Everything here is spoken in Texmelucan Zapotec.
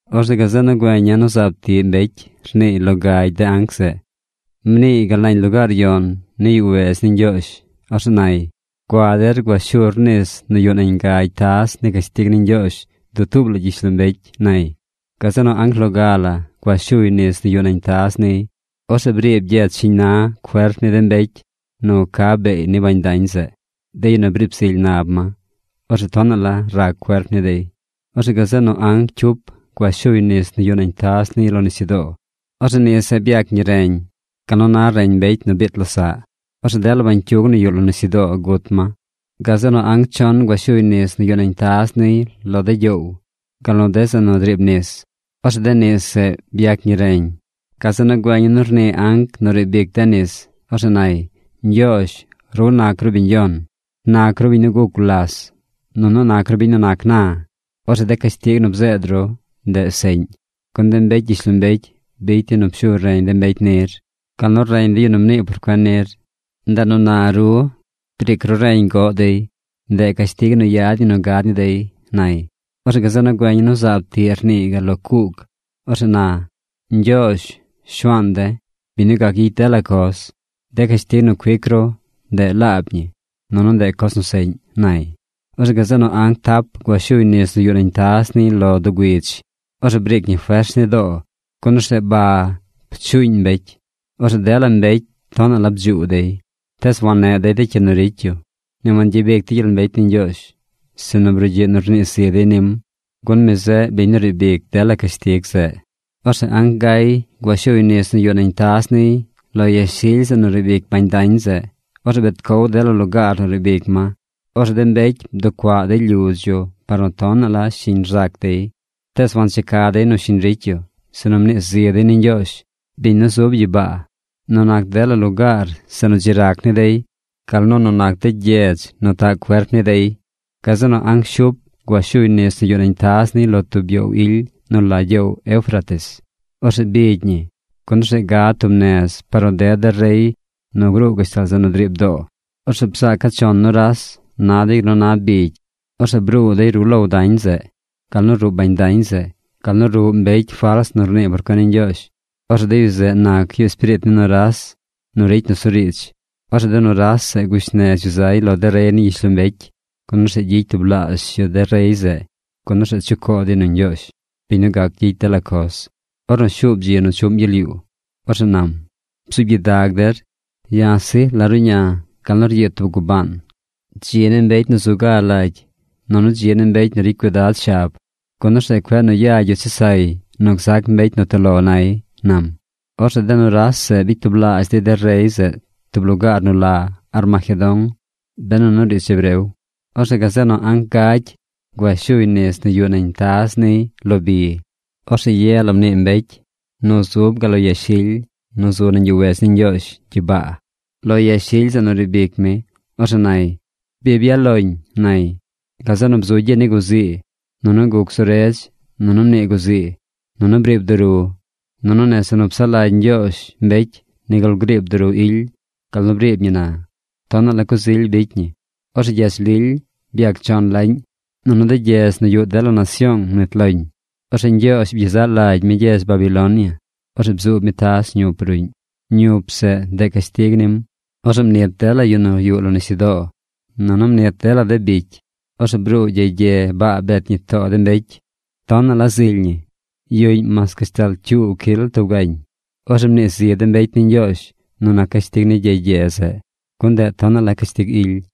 Orzeꞌ gazeꞌ nu güeña̱ nu zaab tiꞌ mbecy rniiy lo gagy de anc zeꞌ. Mniiy gal nañ lugaar yon ni yuꞌ wedz ni Ñgyoozh. Orzeꞌ nay: ―Gua der gua shur nis nu yuꞌ nañ gagy taz ni cashtig ni Ñgyoozh dutuub la gyishlombecy ―nay. Gazeꞌ nu anc loga la gua shuy nis nu yuꞌ nañ taz niy. Orzeꞌ briib gyedz shiñ na cuerp ni de mbecy nu ca beey ni bañ dañ zeꞌ, de yu nu briib zily nab ma. Orzeꞌ tonaꞌ la rac cuerp ni dey. Orzeꞌ gazeꞌ nu anc cyup gua shuy nis nu yuꞌ nañ taz niy lo nisyudoo. Orzeꞌ nis zeꞌ byac ñi reñ gal nu na reñ mbecy nu biit losaꞌ. Orzeꞌ dela bañcyug nu yuꞌ lo nisyudoo gut ma. Gazeꞌ nu anc chon gua shuy nis nu yuꞌ nañ taz niy lo de gyoow, gal nu de zeꞌ nu driib nis. Orzeꞌ de nis zeꞌ byac ñi reñ. Gazeꞌ nu güeña̱ nu rnii anc nu riib ic de nis. Orzeꞌ nay: ―Ñgyoozh, ru nac ru biñ Yon. Nac ru biñ nu guc gulas, nunu nac ru biñ nu nac na. Orzeꞌ de cashtig nu bzeed ru, ndeꞌ seꞌñ. Gun de mbecy gyishlombecy bicy dey nu pshu reñ de mbecy nir, gal nu reñ de yu nu mnii por cuen nir. Ndeꞌ nu na, ru, briic ru reñ goꞌ dey. ¡Ndeꞌ cashtig nu yad ñi nu gad ni dey! ―nay. Orzeꞌ gazeꞌ nu güeña̱ nu zaab tiꞌ rnii gal lo cuug. Orzeꞌ na: ―Ñgyoozh, Shuaan de̱, biñ nu gac gyicy dela coz, de cashtig nu cuic ru, ndeꞌ laab ñi, nunu ndeꞌ coz nu seꞌñ ―nay. Orzeꞌ gazeꞌ nu anc tap gua shuy nis nu yuꞌ nañ taz niy lo doo güidz. Orzeꞌ briic ñi fers ni doo, gun orzeꞌ ba pchuuñ de mbecy. Orzeꞌ dela mbecy tonaꞌ la bdzuu dey. Tees wanneꞌ dey de cyi nu ricy yu. Ni wangyabic dey gyel mbecy ni Ñgyoozh. Sinu brugyiꞌ nu rnii zi dey nim, gun mi zeꞌ biñ nu riib ic dela cashtig zeꞌ. Orzeꞌ anc gay gua shuy nis nu yuꞌ nañ taz niy lo yashily zeꞌ nu riib ic bañ dañ zeꞌ. Orzeꞌ bet cow dela lugaar nu riib ic ma. Orzeꞌ de mbecy bducuaꞌ dey lyudz yu par nu tonaꞌ la shiñ rzac dey. Tees wancheca dey nu shiñ ricy yu, sinu mnii zi dey ni Ñgyoozh, biñ nu zub gyibaa, nu nac de lugaar zeꞌ nu dzi rac ni dey gal nu nu nac de gyedz nu taꞌ cuerp ni dey. Gazeꞌ nu anc shup gua shuy nis nu yuꞌ nañ taz niy lo tub gyoow ily nu la gyoow Eufrates. Orzeꞌ bigy ñi, gun orzeꞌ gad tub nez par nu ded de rey nu gruu gashtal zeꞌ nu driib doo. Orzeꞌ bzaaca̱ chon nuras. Na dey gal nu na bigy. Orzeꞌ bruu dey ruꞌ low dañ zeꞌ, gal nu ruꞌ bañ dañ zeꞌ, gal nu ruꞌ mbecy fals nu rnii por cuen ni Ñgyoozh. Orzeꞌ de yu zeꞌ nac yu espiriit ni nuras nu ricy nusuriidz. Orzeꞌ de nuras zeꞌ gush nez yu zay lo de rey ni gyishlombecy, gun orzeꞌ gyicy tublaazh yu de rey zeꞌ, gun orzeꞌ chucoo dey nu Ñgyoozh, biñ nu gac gyicy dela coz, ornu shuub dzi nu chuꞌm gyel yuu. Orzeꞌ nam: ―Bzuub gyidag der. Ya̱ sij la ruꞌña̱ gal nu ryiid tub gubaan. Dzi ni mbecy nu zu ga lagy nunu dzi ni mbecy nu ricy cuidad shab, gun orzeꞌ cueꞌ nu yagy yu chesay nu gzac mbecy nu toꞌ lo nay ―nam. Orzeꞌ de nuras zeꞌ bicy tublaazh dey de rey zeꞌ tub lugaar nu la Armagedón benu nu riidz hebreo. Orzeꞌ gazeꞌ nu anc gagy gua shuy nis nu yuꞌ nañ taz niy lo bi. Orzeꞌ ye la mnii mbecy gal lo yashily nu zub nañ yuꞌ wedz ni Ñgyoozh gyibaa, lo yashily zeꞌ nu riib ic mi. Orzeꞌ nay: ―¡Bi byaꞌ loñ! ―nay. Gazeꞌ nu bzu gyi ni guzii. Nunu guc zu redz. Nunu mnii guzii. Nunu briib duru. Nunu nese nu psaꞌ lagy Ñgyoozh mbecy nigul griib duru ily gal nu briib ñi na. Tonaꞌ la coz ily bicy ñi. Orzeꞌ gyedz lily byac chon laꞌñ. Nunu de gyedz nu yuꞌ dela nasyoong mnit loñ. Orzeꞌ Ñgyoozh byezaꞌ lagy mi gyedz Babilonia. Orzeꞌ bzuub mi taz ñup ruꞌñ. Ñup zeꞌ, ndeꞌ cashtig nim. Orzeꞌ mnit dela yu nu yuꞌ lo nisyudoo. Nunu mnit dela de bicy. Orzeꞌ bruu gyey gye baa bet ñi too de mbecy. Tonaꞌ la zily ñi. Yuꞌñ mas gashtal cyuu cyil tub gañ. Orzeꞌ mnii zi de mbecy ni Ñgyoozh nu nac cashtig ni gyey gye zeꞌ, gun ndeꞌ tonaꞌ la cashtig ily.